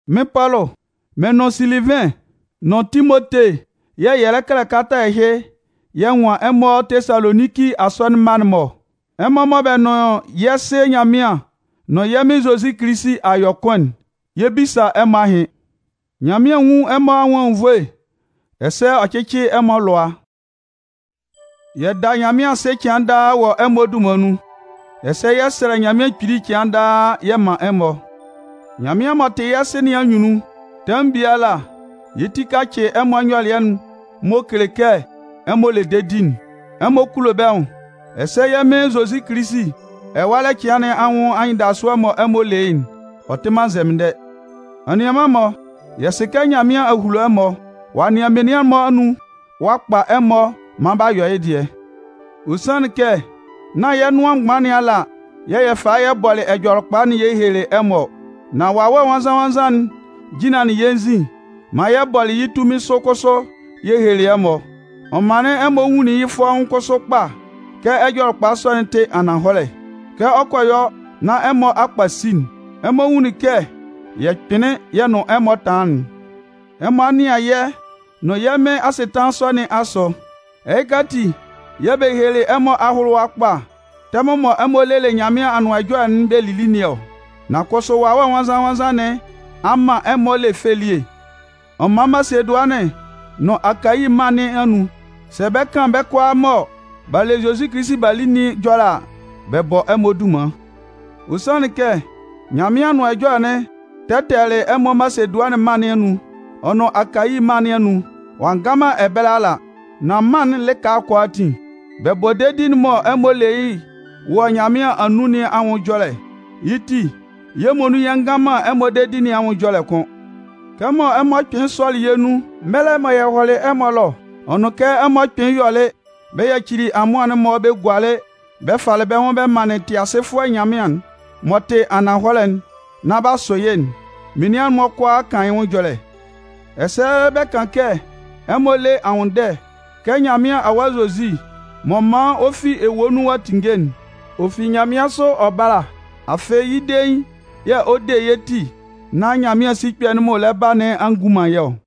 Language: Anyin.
Mɩ́n Pɔlʋ, mɩ́n nʋn Silivɩn nʋn Timote yɛ̂ yɛ lɛ kɛlɛ kalata ɛhɩ yɛ nwan ɛmɔ Tesaloninki asɔnɩn mma'n-mɔ ɔ. Ɛmɔ mɔ bɛ nʋn yɛ́ Sɩ Nyanmɩan nʋn yɛ́ Mɩn Zozi Kilisi a yɔ kʋn'n, yɛ 'bisa ɛmɔ ahɩn. Nyanmɩan nwún ɛmɔ anwʋn anwunnvoe, ɛsɛ ɔ cɩ́cɩ ɛmɔ alʋa. Yɛ da Nyanmɩan asɩ cɩan daa wɔ ɛmɔ dunman nun, ɛsɛ yɛ sɛlɛ Nyanmɩan Kpili cɩan daa yɛ man ɛmɔ. Nyanmɩan m'ɔ tɩ yɛ́ Sɩ nɩn anyunnun, tɛmʋn biala yɛ́ ti kacɩ ɛmɔ nyɔlɩɛ'n m'ɔ kele kɛ ɛmɔ le dedi, ɛmɔ kulo bɛ́ nwʋn, ɛsɛ yɛ́ Mɩn Zozi Kilisi ɛwalɛ cɩan nɩn anwʋn anyɩndasʋɛ mɔ ɛmɔ le yɩ́'n, ɔ tɩ man nzɛmɩndɛ. Anianman-mɔ, yɛ sɩ kɛ Nyanmɩan a hulo ɛmɔ, ɔ'a nɩan menian'n-mɔ anun ɔ'a kpa ɛmɔ maan b'a yɔ yɩ́ dɩɛ. Ɔ sanlɩn kɛ nán yɛ́ nʋan mgban nɩn ala yɛ̂ yɛ falɩ yɛ bɔlɩ Ɛjɔlɛkpa'n yɛ helelɩ ɛmɔ ɔ. Nan Wawɛ Nwannzan-nwannzan'n jinlanlɩn yɛ́ nzin maan yɛ bɔlɩ yɩ́ tunmin sʋ kʋsʋ yɛ helelɩ ɛmɔ. Ɔ manlɩn ɛmɔ nwunlin yɩ́ fɔ́ʋ́n kʋsʋ kpa kɛ Ɛjɔlɛkpa sɔ'n tɩ ananhɔlɛ. Kɛ ɔ kɔ yɔ nán ɛmɔ a kpasi'n, ɛmɔ nwunlin kɛ yɛ kpɩnlɩn yɛ nʋn ɛmɔ tanlanlɩn'n. Ɛmɔ a nɩan yɛ́ nʋn yɛ́ Mɩn asɩtanlan sɔ nɩn asʋ. Ɛhɩka ati yɛ̂ bɛ helelɩ ɛmɔ ahʋlʋwa kpa tɛmʋn mɔ ɛmɔ lelɩ Nyanmɩan Anʋan Ɛjɔlɛ'n bɛ lili nɩn ɔ. Nan kʋsʋ Wawɛ Nwannzan-nwannzan nɩn a man ɛmɔ le fɛ elie. Ɔ man Masedʋanɩn nʋn Akayi mân nɩn anun, sɛ bɛ 'kan bɛ́ kʋalaa mɔ b'a le Zozi Kilisi b'a li nɩn ɛjɔlɛ a, bɛ bɔ ɛmɔ dunman. Ɔ sanlɩn kɛ Nyanmɩan Anʋan Ɛjɔlɛ'n tɛtɛlɩ ɛmɔ Masedʋanɩn mân nɩn anun ɔ nʋn Akayi mân nɩn anun. Ɔ'a nga man ɛbɛlɛ ala, nan mân'n lɩka kʋalaatin, bɛ bɔ dedi'n mɔ ɛmɔ le yɩ́ wɔ Nyanmɩan anun nɩn anwʋn ɛjɔlɛ. Yɩ́ ti, yɛ́ muonun yɛ ngan man ɛmɔ dedi nɩn anwʋn ɛjɔlɛ kʋ́n. Kɛ ɛmɔ kpɩnlɩn sɔlɩ yɛ́ nun mɛlɛ mɔ yɛ hɔlɩ ɛmɔ ɛlɔ, ɔ nʋn kɛ ɛmɔ kpɩnlɩn yɔlɩ bɛ yacili amʋan'n-mɔ bɛ gualɩ bɛ falɩ bɛ́ nwʋn bɛ manlɩn Tɩasɩfʋɛ Nyanmɩan'n m'ɔ tɩ ananhɔlɛ'n nán b'a sʋ yɩ́'n, menian'n-mɔ kʋalaa kan yɩ́ nwʋn ɛjɔlɛ. Ɛsɛ bɛ kan kɛ ɛmɔ lɛ nwʋnndɛ kɛ Nyanmɩan Awa Zozi m'ɔ man ɔ fi ewue nun ɔ'a tinnge'n, ɔ fi nyanmɩansʋ ɔ bála. Afɩ, yɩ́ dein yɛ̂ ɔ de yɛ́ ti nán Nyanmɩan sikpɛ'n m'ɔ lɛ ba nɩn a ngun man yɛ́ ɔ.